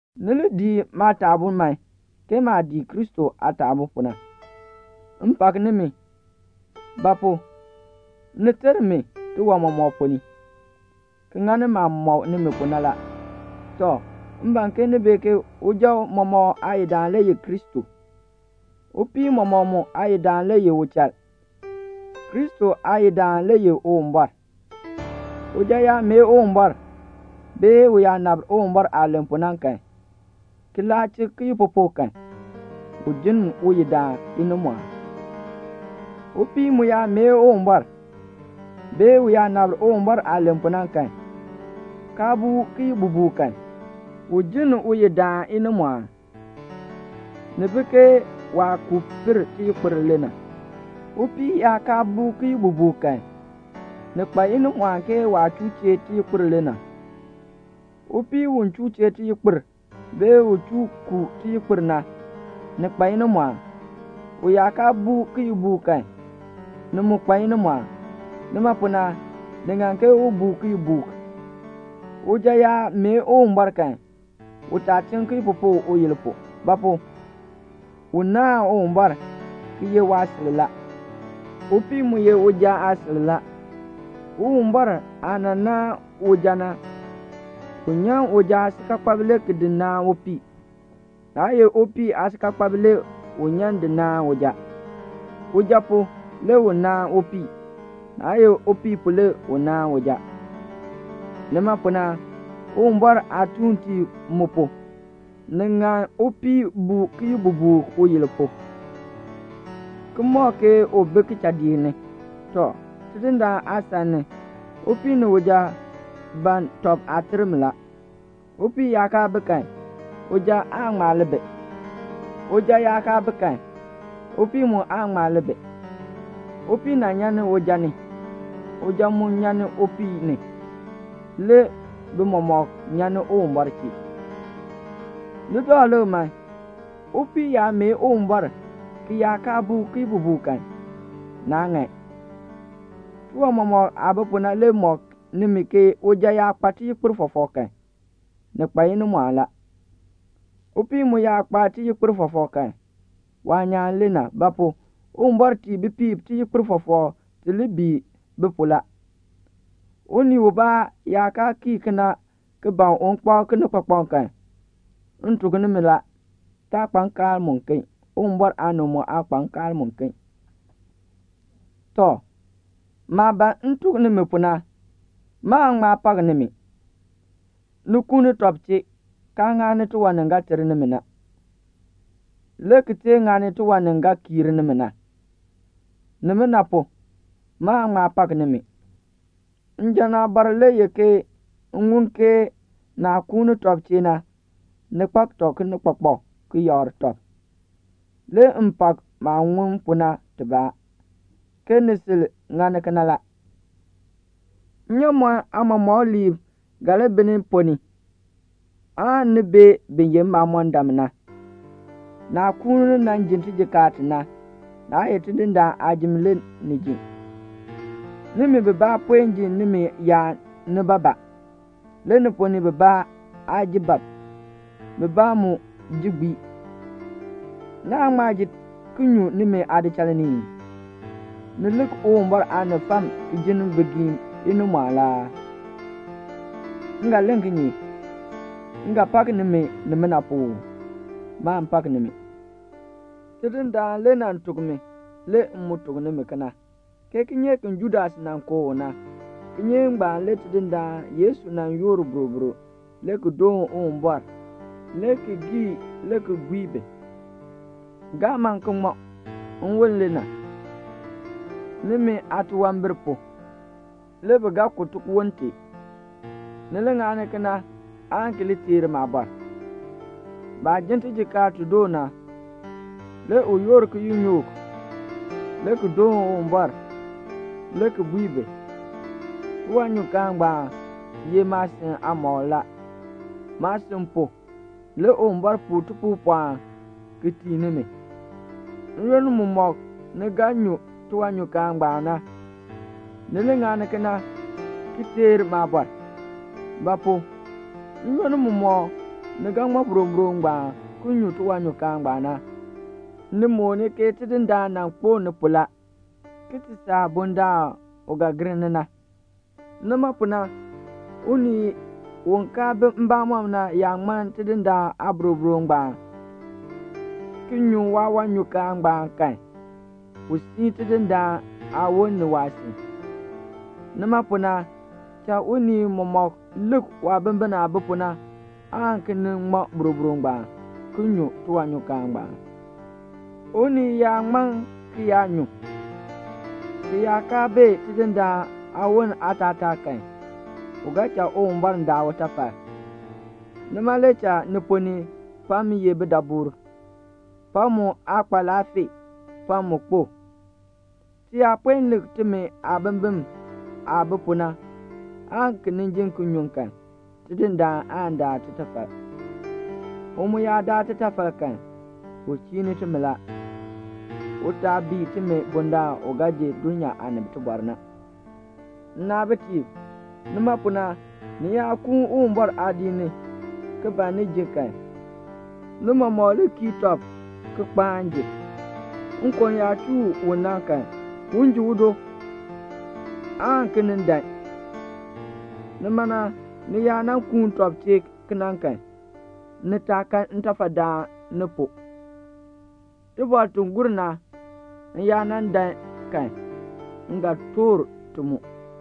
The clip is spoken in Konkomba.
Ni lii dii maataabuu man, ke maah dii Kristo aataabuu pu na. M pak nimi; ba pu? ni teer mi tiwan mɔmɔk ponn ni, ki ŋani maah mɔk nimi pu na la. Tɔ, m ban ke ni bee ke uja mɔmɔk aayidaan le ye Kristo; upii mɔmɔk mu aayidaan le ye uchal; Kristo aayidaan le ye Uwumbɔr. Uja yaa mee Uwumbɔr, bee u yaa nabr Uwumbɔr aah len pu na kan, ki laa chik kiyikpupuk kan, u jinn uyidaan inimɔɔn. Upii mu yaa mee Uwumbɔr, bee u yaa nabr Uwumbɔr aah len pu na kan, kaa buu kiyibubuuk kan, u jinn uyidaan inimɔɔn. Ni bi ke waah kuu pir tiyikpir le na. Upii yaa kaa buu kiyibubuuk kan, ni kpa inimɔɔn ke waah chuu chee tiyikpir le na. Upii u chuu chee tiyikpir, bee u chuu kuu tiyikpir na, ni kpa inimɔɔn. U yaa kaa buu kiyibubuuk kan, ni mu kpa inimɔɔn. Nima pu na, ni ŋan ke u buu kiyibubuuk. Uja yaa mee Uwumbɔr kan, u taa chiŋ kiyikpupuk uyil pu; ba pu? u naahn Uwumbɔr, ki ye waasil la. Upii mu ye uja aasil la. Uwumbɔr aah nan naan uja na, u nyan uja aasikaakpab le ki di naan upii, naa ye upii aasikaakpab le u nyan di naan uja. Uja pu, le u nan naan upii. Naa ye upii pu le u nan naan uja. Nima pu na, Uwumbɔr aatuuntiib mu pu, ni ŋan upii buu kiyibubuuk uyil pu, ki mɔk ke u bi kichadiik ni. Tɔ, Tidindaan aasan ni, upii ni uja ban tɔb aaterm la. Upii yaa kaa bi kan, uja aan ŋma li bi. Uja yaa kaa bi kan, upii mu aan ŋma li bi. Upii nan nyan ni uja ni. Uja mu nyan ni upii ni. Le bi mɔmɔk nyan ni Uwumbɔr chee. Ni dakl lik man. Upii yaa mee Uwumbɔr ki yaa kaa buu kiyibubuuk kan, naa ŋan. Tiwan mɔmɔk aah bi pu na le mɔk nimi ke uja yaa kpa tiyikpir fɔfɔk kan, ni kpa inimɔɔn la. Upii mu yaa kpa tiyikpir fɔfɔk kan, waanyaan le na. Ba pu? Uwumbɔr tii bipiib tiyikpir fɔfɔk ti li bii bi pu la. Unii ubaa yaa kaa kii kena ki ban un kpak kinikpakpak kan, m tuk nimi la, taa kpa nkaal muken. Uwumbɔr aanib mu aa kpa nkaal muken. Tɔ, maah ban m tuk nimi pu na, maan ŋma pak nimi. Ni kuuni tɔb chee, kaa ŋani tiwan ni ga ter nimi na, le ki tee ŋani tiwan ni ga kiir nimi na. Nimina pu, maan ŋma pak nimi. Njan aabɔr le ye m ŋun ke naah kuuni tɔb chee na, ni kpak tɔb kinikpakpak, ki yakr tɔb. Le m pak maah ŋun pu na tibaa, ke ni sil ŋani kena la. Nnyaamɔn aamɔmɔkliib ga li bi ni ponn ni aan ni bee bin ye mbamɔndam na. Naah kuuni nan ji tijikaar ti na, naa ye Tidindaan aajim le ni ji. Nimi bibaa puen ji nimi yaan nibaabaa. Le ni ponn ni bibaa aa ji bab. Bibaa mu ji gbii. Naan ŋma ji ki nyu nimi aadichal ni ii? Ni lik Uwumbɔr aanib fam ki jinn bigiim inimɔɔn la aa? M ga len kinye? M ga pak nimi nimina pu uu? Maan pak nimi. Tidindaan le nan tuk mi, le m mu tuk nimi kena, ke kinyeek ki Judas nan kooh u na, kinyeek ngbaan le Tidindaan Yesu nan yoor boroboro le ki doon Uwumbɔr, le ki gii, le ki bui bi, "[Gaa man ki ŋman.] Nwon le na. Nimi aatunwambir pu, le bi ga ku tiwon tee. Ni li ŋani kena aan ki li teer maabɔr." Baah jin tijikaar ti doo na, le u yoor kiyinyook le ki doon Uwumbɔr, le ki bui bi, "Tiwanyukaan ngbaan ye maasin aamɔkl la. Maasin pu, le Uwumbɔr puu tipuupɔln ki tii nimi. N-yoonn mumɔk ni ga ti nyun tiwanyukaan ngbaan na, ni li ŋani kena ki teer maabɔr." Ba pu? n-yoonn mumɔk ni ga ŋmɔ boroboro ngbaan, ki nyun tiwanyukaan ngbaan na, ni mooni ke Tidindaan nan kpo ni pu la, ki ti saa bundaln u ga gir ni na. Nima pu na, unii u kaa bi mbamɔm na yaa ŋman Tidindaan aaboroboro ngbaan, ki nyu waawanyukaan ngbaan kan, u sii Tidindaan aawon ni waasin. Nima pu na cha unii mɔmɔk lik waabimbin aah bi pu na aan ki nin ŋmɔ boroboro ngbaan ki nyu tiwanyukaan ngbaan. Unii yaa ŋman ki yaa nyu, ki yaa kaa bee Tidindaan aawon aatataa kan, u ga cha Uwumbɔr daa utafal la. Nima le cha ni ponn ni pam ye bidaburb, pam mu aa kpa laafee, pam mu kpo. Ti yaa puen lik timi aabimbin aah bi pu na, aan ki nin ji ki nyun kan, Tidindaan aan daa titafal. U mu yaa daa titafal kan, u chiini timi la, u taa bii timi bundaln u ga ji dulnyaa aanib tibɔr na. Nnaabitiib, nima pu na, ni yaa kuun Uwumbɔr aadiik ni ki ban ni ji kan, ni mɔmɔk li kii tɔb ki kpaan ji. Nkon yaa chuu u na kan, un ji udo aan ki nin dan. Nima na ni yaa nan kuun tɔb chee kena kan, ni taa kan ntafadaan ni pu. Tibɔr ti gur na, m yaa nan dan kan, m ga toor ti mu.